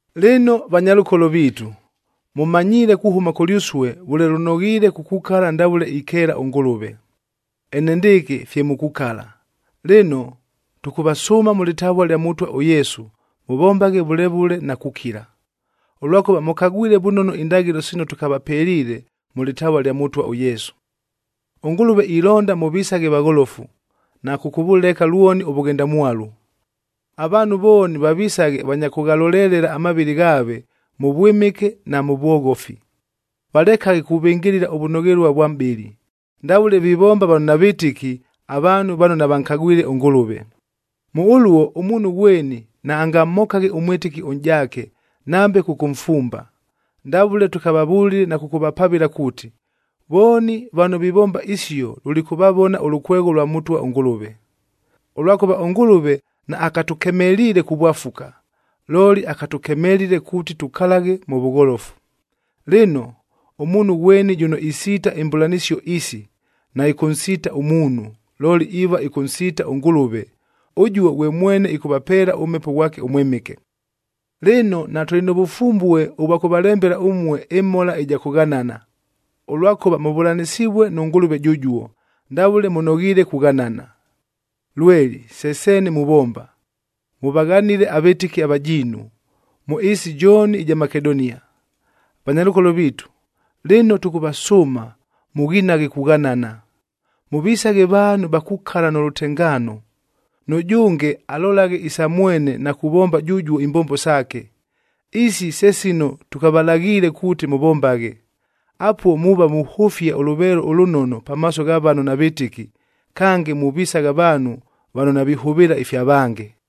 Lɨno vanyalʉkolo viitu, mʉmanyiile kuhʉma kʉlyʉsue vʉle lʉnoghiile kukukala ndavʉle ikeela ʉNgʉlʉve. Enendɨɨkɨ fye mukukala, lɨno, tʉkʉvasʉʉma mʉ lɨtavua lya Mʉtwa ʉYesu mʉvombaghe vʉle vʉle na kukila. Ʉlwakʉva mʉkagwile vʉnono indaghɨlo sino tʉkavapeliile mʉ lɨtavua lya Mʉtwa ʉYesu. ɄNgʉlʉve ilonda mʉvisaghe vagholofu, na kʉkʉvʉleka lwoni ʉvʉghendamwalu. Avaanhu vooni vavisaghe vanya kʉghalolelela amavɨlɨ ghaave, mʉ vwɨmɨke na mʉ vwoghofi. Valekaghe kuvɨngɨlɨla ʉvʉnoghelua vwa mʼbɨlɨ, ndavʉle vivomba vano navɨtɨki, avaanhu vano navankagwile ʉNgʉlʉve. Mʉ ʉluo, ʉmuunhu ghweni naangamhokaghe ʉmwɨtɨki ʉnʼjaake, nambe kʉkʉmfumba. Ndavʉle tʉkavavʉlile na kʉkʉvapavɨla kuuti, vooni vano vivomba isio lulikʉvavona ʉlʉkwegho ʉlwa Mʉtwa ʉNgʉlʉve. Ʉlwakʉva ʉNgʉlʉve naakatʉkemeliile kuvwafuka, looli akatʉkemelile kuuti tukalaghe mʉ vʉgholofu. Lɨno, ʉmuunhu ghweni jʉno isiita imbʉlanɨsio isi, naɨkʉnsiita ʉmuunhu, looli iiva ɨkʉnsiita ʉNgʉlʉve, ʉjuo ghwe mwene ɨkʉvapeela ʉMhepo ghwake ʉMwɨmɨke. Lɨno, natʉlɨ nʉ vʉfumbue ʉvwa kʉvalembela ʉmue ɨmhola ɨja kʉghanana, ʉlwakʉva mʉvʉlanɨsivue nʉ Ngʉlʉve jʉjuo, ndavʉle mʉnoghiile kughanana. Lweli se seene muvomba, mʉvaghanile avɨtɨki avajiinu, mʉ ɨɨsi jooni ɨja Makedonia. Vanyalʉkolo viitu, lɨno tʉkʉvasʉʉma mʉghinaghe kughanana. Mʉvisaghe vaanhu va kukala nʉ lʉtengaano, nʉjʉnge alolaghe isa mwene na kuvomba jʉjuo imbombo saake. Isi se sino tʉkavalaghiile kuuti mʉvombaghe. Apuo muuva muhʉfia ʉlʉveelo ʉlʉnono pamaaso gha vano navɨtɨki, kange muvisagha vaanhu vano navihʉvɨɨla ifya vange.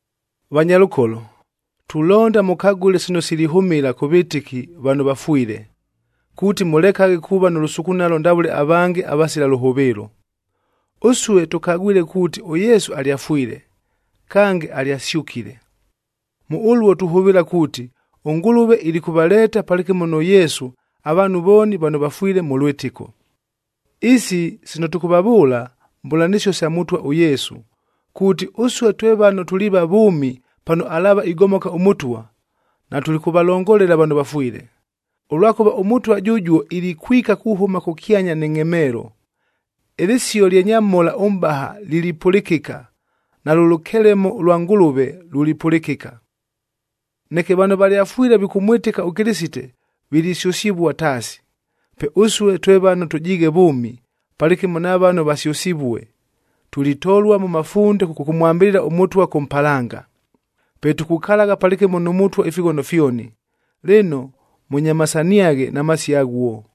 Vanyalʉkolo, tulonda mʉkagʉle sino silihʉmɨla kʉ vɨtɨki vano vafwile, kuuti mʉlekaghe kuuva nʉ lʉsukunalo ndavʉle avange avasila lʉhʉvɨɨlo. Ʉsue, tʉkagwile kuuti ʉYesu alyafwile, kange alyasyʉkile. Mʉ ʉluo tuhʉvɨɨla kuuti, ʉNgʉlʉve ilikʉvaleeta palɨkɨmo nʉ Yesu avaanhu vooni vano vafwile mʉ lwɨtɨko. Isi sino tʉkʉvavʉʉla, mbʉlanɨsio sa Mʉtwa ʉYesu kuuti, ʉsue twe vano tuliiva vʉʉmi pano alaava igomoka ʉMʉtwa, natulikʉvalongolela vano vafwile. Ʉlwakʉva ʉMʉtwa jʉjuo ilikwika kuhʉma kʉkyanya nɨ ngʼhemeelo, ɨlɨsio lya nyamhola ʉmʼbaha lilipʉlɨkɨka, nalʉ lʉkelemo ʉlwa Ngʉlʉve lulipʉlɨkɨka. Neke vano valyafwile vikʉmwɨtɨka ʉKɨlɨsite, vilisyʉsɨvua taasi. Pe ʉsue, twe vano tʉjiighe vʉʉmi, palɨkɨmo na vano vasyʉsivue, tulitolua mʉ mafunde kʉkʉmwambɨlɨla ʉMʉtwa kʉ mpalanga. Pe tukukalagha palɨkɨmo nʉ Mʉtwa ifighono fyoni. Lɨno, mʉnyamasaniaghe na masio aghuo.